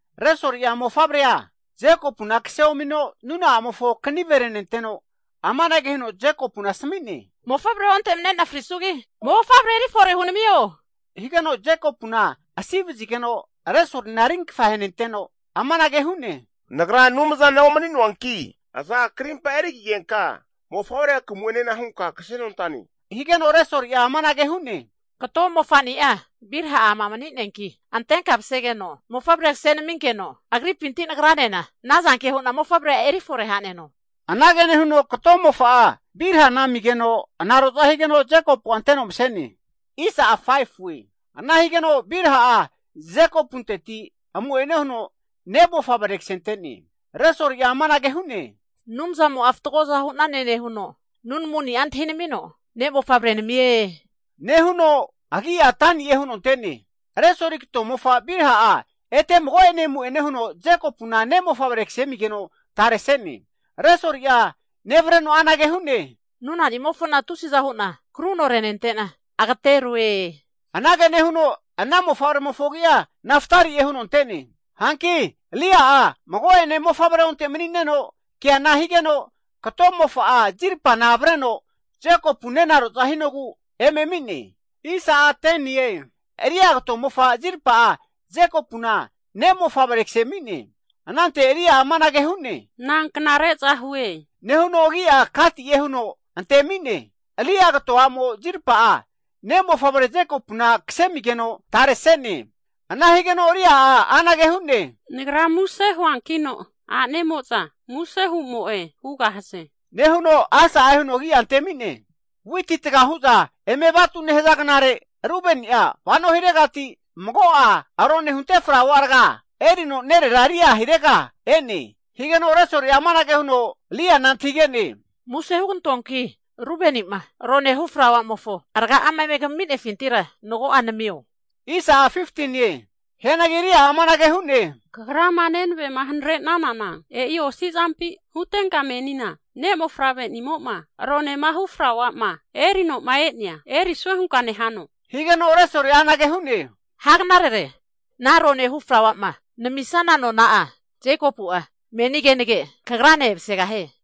Resoli'a mofavre Jekopuna kase omino nuna'amofo kahiru henenteno, Jekopuna amanage huno asmi'ne, mofavre onte manine'na frisugi, Mofavre eri fore hunamio. Higeno Jekopuna asi vazigeno Resolina rinkfa henenteno, amanage hu'ne, Nagra Anumzana omni'noanki, aza karimpa hagerfigenka mofavre kamu'ene nosane. Resoli amanage hu'ne, Kato mofani'a Bilha ama mani'neanki, antenka msegeno mofavre kse naminkeno, agripinti nagranena anazanke hu'na mofavre antaneno. Ana huno kato mofa'a Bilhana amigeno anaroza higeno, Jekopu'a anteno mse'ne, ana higeno Bilha'a Jekopunteti amu'ene huno ne'mofavre ksente'ne. Resoli'a amanage hu'ne, Anumzamo fatgoza hu'nane nehuno, nunamuni'a antahino ne'mofavre namie. Ananku huno agi'a Dani'e huno ante'ne. Resoli kato mofa Bilha ete mago'ene amu'ene huno Jekopuna ne'mofavre kse amigeno tare se'ne. Resoli'a nevreno anage hu'ne, Nuna nimofona tusiza hu'na kruno renente'na agateroe. Anage nehuno ana mofavremofo agi'a Naftali'e, huno ante'ne. Hanki Lea'a mago'ene mofavre onte mani'neno keana higeno, kato mofa'a Zilpana avreno Jekopu nenaroza hinogu eme ami'ne. Lea kato mofa Zilpa'a Jekopuna ne'mofavre kse ami'ne. Anante Lea'a amanage hu'ne, Na knare'za hue, nehuno agi'a Gati'e huno antemi'ne. Lea kato a'mo Zilpa ne'mofavre Jekopuna kse amigeno tare se'ne. Ana higeno Lea'a anage hu'ne, Nagra muse nehue, a'nemo'za muse hu'moe hugahaze. Nehuno Asa'e huno agi'a antemi'ne. Witi taga hu'za eme vatu nehaza gnare, Rubeni'a vano hiregati mago'a rone hunte flaua rga'a (Mandrake) erino nerera Lea hirega e'ne. Higeno Resoli'a amanage huno Leana antahige'ne, Muse (plis) hugantoanki Rubeni'ma rone hunte flaua'mofo rga'a eme kamifintira mago'a namio. Hianagi Lea'a amanage hu'ne, Kagra nenavema hanrena'nana osi zampi? Hutenka meni ne' mofavre'nimofo rone hu flaua erisue nehano? Higeno Resoli anage hu'ne, Ha knarere, ana ronehu flauama namisanana nona'a Jekopu'a meni kenage kagrane emasegahie.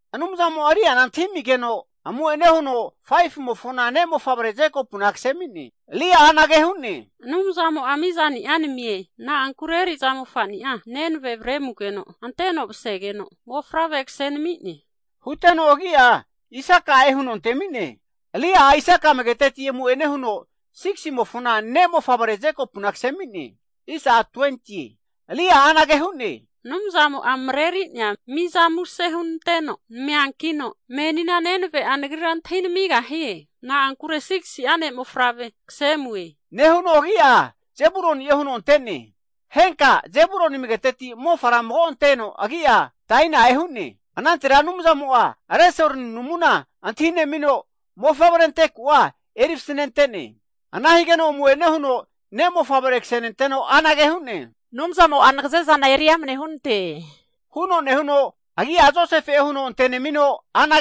Anumzamo Leana antahi amigeno, amu'ene huno 5fu'mofona ne'mofavre Jekopu'na kse ami'ne. Lea ksenenteno anage hu'ne, Anumzamo mizani'a namie, na'ankure eri'za mofani'a nenve avre ami'nogu huno nami'ne. Huteno agi'a Isaka'e huno antemi'ne. Lea'a Isaka amageteti amu'ene huno 6simofona ne'mofavre Jekopuna antemi'ne. Lea'a anage hu'ne, Anumzamo mreri'nea miza muse hunanteno nami'ne. Menia nenave'a nagrane manigahie. Na'ankure 6si'a ne'mofavre kse amue. Nehuno agi'a Zebuluni'e huno ante'ne. Henka'a Zebulun amagetetira mofara mago anteno agi'a Daina'e hu'ne. Anantera Anumzamo Resolina, antahi'nemino mofavre ante ku'a vasnente'ne. Ana higeno amu'ene huno ne'mofavre ksenenteno anage hu'ne: Nagazeza Anumzamo eri amne hunante. Anumzamo ne'mofavre mago'ene namisie, huno nehuno agi'a Josefe'e huno antemi'ne.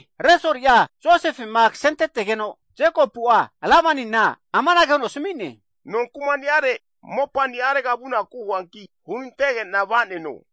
Resoli'a Josefena kasentetegeno Jekopu'a Labani amanage huno asmi'ne, ha kuma'nirega mopa ni'are vanuanki hunantege'na va'neno.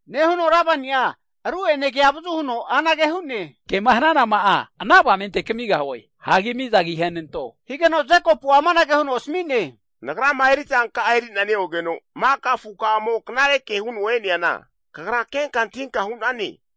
Labani'a ru'ene ke avazu huno hu'ne, Mizanka'a agi ahe nasamio, ke hnanama'a ana avamente kamigahue. Jekopu'a amanage huno asmi'ne, Nagrama eri'zanka'a eri'na neogeno maka afukamo knareke huno e'neana, kagra kenka antahinka hu'nane,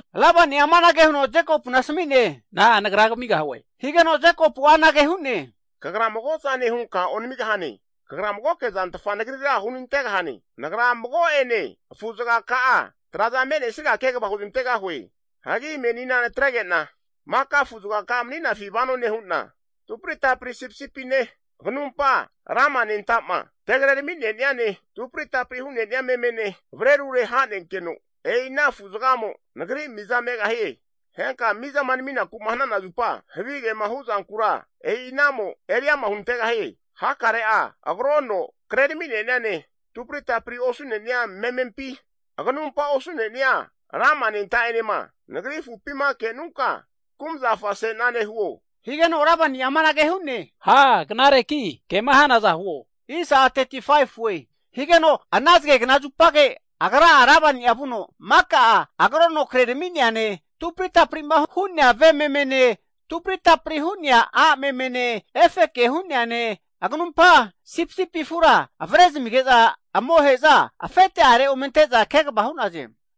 Labani'a amanage huno Jekopuna asmi'ne, Na'a nagra kamigahue? Nehigeno Jekopu'a anage hu'ne, Kagra mago zane hunka onamigahane. Kagra magoke zantfa nagrira hunantegahane, nagra mago'ene hu'na afuka'a zga traza me'nesirega kegva hugantegahue, menina natrege'na maka afu zgaka'a mani'nafi vano nehu'na, tupri tapri sipisipine, aganumpa lama anentamo tegre ramine'niane, tupri tapri hu'nenia memene avre rure ha'nenkeno, e'i ana afu'zgamo nagri miza megahie. Henka mizama naminaku hnana zupa, havigema hu'zankura e'i anamo eriama hunantegahie. Hakare'a agrono kre ramineni'ane, tupri tapri osu'nenia memempi, aganumpa osu'nenia lama anenta'enema, nagri afupima kenunka kumzafa se'nane huo. Labani'a amanage hu'ne, Ha knareki kema hanaza huo. Higeno ana zge zupage, agra'a Labani'a vuno maka'a agrono krerami'neane, tupri tapri hune'a ve memene tupri tapri hu'nea a' memene, efeke hu'neane, agnumpa sipisipi afura afete'are amohe'za ome anteza kegva hu'naze.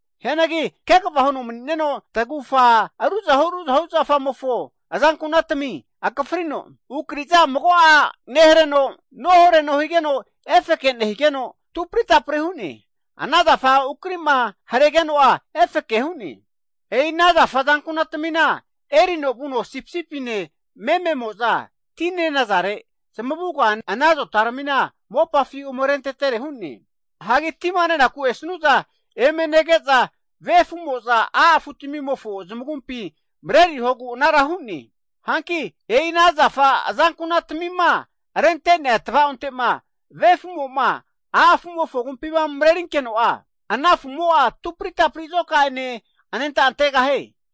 Hianagi kva huno mani'neno tgufa ruzahu ruzahu zafamofo azankunatmi akafrino, ukari'za mago'a nehareno nohreno higeno efeke nehuno tupri tapri hu'ne. Ana zafa ukari'ma haregeno'a efeke hu'ne. E'i ana zafa azankunara erino vuno sipisipine mememo'za ti netere nehaza zamure tinkampi, ana zota mopafi ome rentere hu'ne. Tima nenaku esanu'za eme kehogu arentetere hu'ne. Tima nenaku esnu'za ve afu'mo a' afu'mofo agumpi mrerigahie. Hanki e'i ana zafa azanku'na tmi rente'nea tva'onte ve afu'mo a' afu agumpi mrerinkeno ana afu'mo tupri tapri azoka'ene anenta antegahie.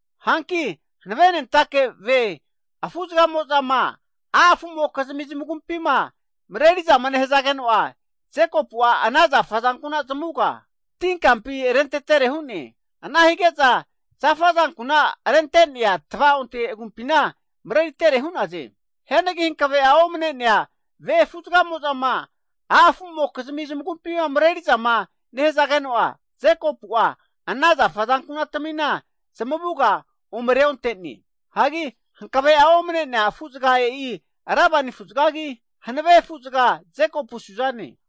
Hanki hanve afu'zgamo agumpi mareriza nehazageno'a, Jekopu'a ana zafa azankuna zamuga tinkampi arentetere hu'ne, ana hige'za zafa azankuna arentenea tva'onte agumpina mreritere hu'naze, Hianagi hankve'a omne'nea afu'zgamo, vea'za huku nehigeno'a ana zafa azankunara ome reonte'ne, hankve'a omne'nea afu'zga e'i Labani afu'zge hanve afu'zga Jekopu suzane.